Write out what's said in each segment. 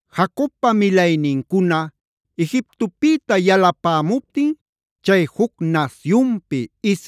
Jacobpa milaynincuna Egiptopïta yalapämuptin, chay juc nasyunpi,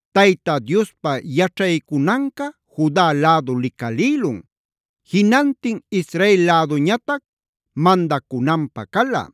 Tayta Diospa yaćhaycunanca Juda lädu licalïlun. Jinantin Israel läduñatac mandacunanpä cala.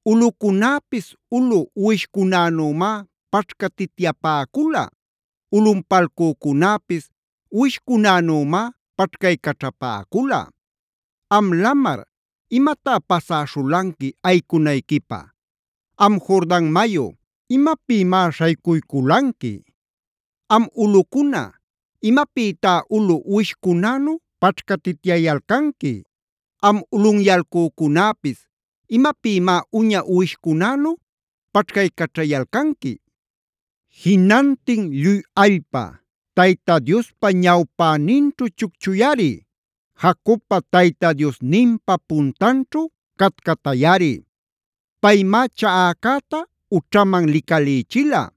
Ulꞌucunäpis ulu uwishcunänümá paćhcatityapäcula. Ulꞌunpalcücunäpis uwishcunänümá paćhcaycaćhapäcula. Am lamar, ¿imatá pasäśhulanqui ayicunayquipä? Am Jordan mayu, ¿imapïmá śhaycuyculanqui? Am ulꞌucuna ¿imapïtá ulu uwishcunänu paćhcatityayalcanqui? Am ulꞌunyalcücunäpis ¿imapïmá uña uwishcunänu paćhcaycaćhayalcanqui? Jinantin lluy allpa, Tayta Diospa ñawpäninćhu chucchuyꞌari. Jacobpa Tayta Diosninpa puntanćhu catcatayꞌari. Paymá chaꞌacäta ućhaman licalïchila.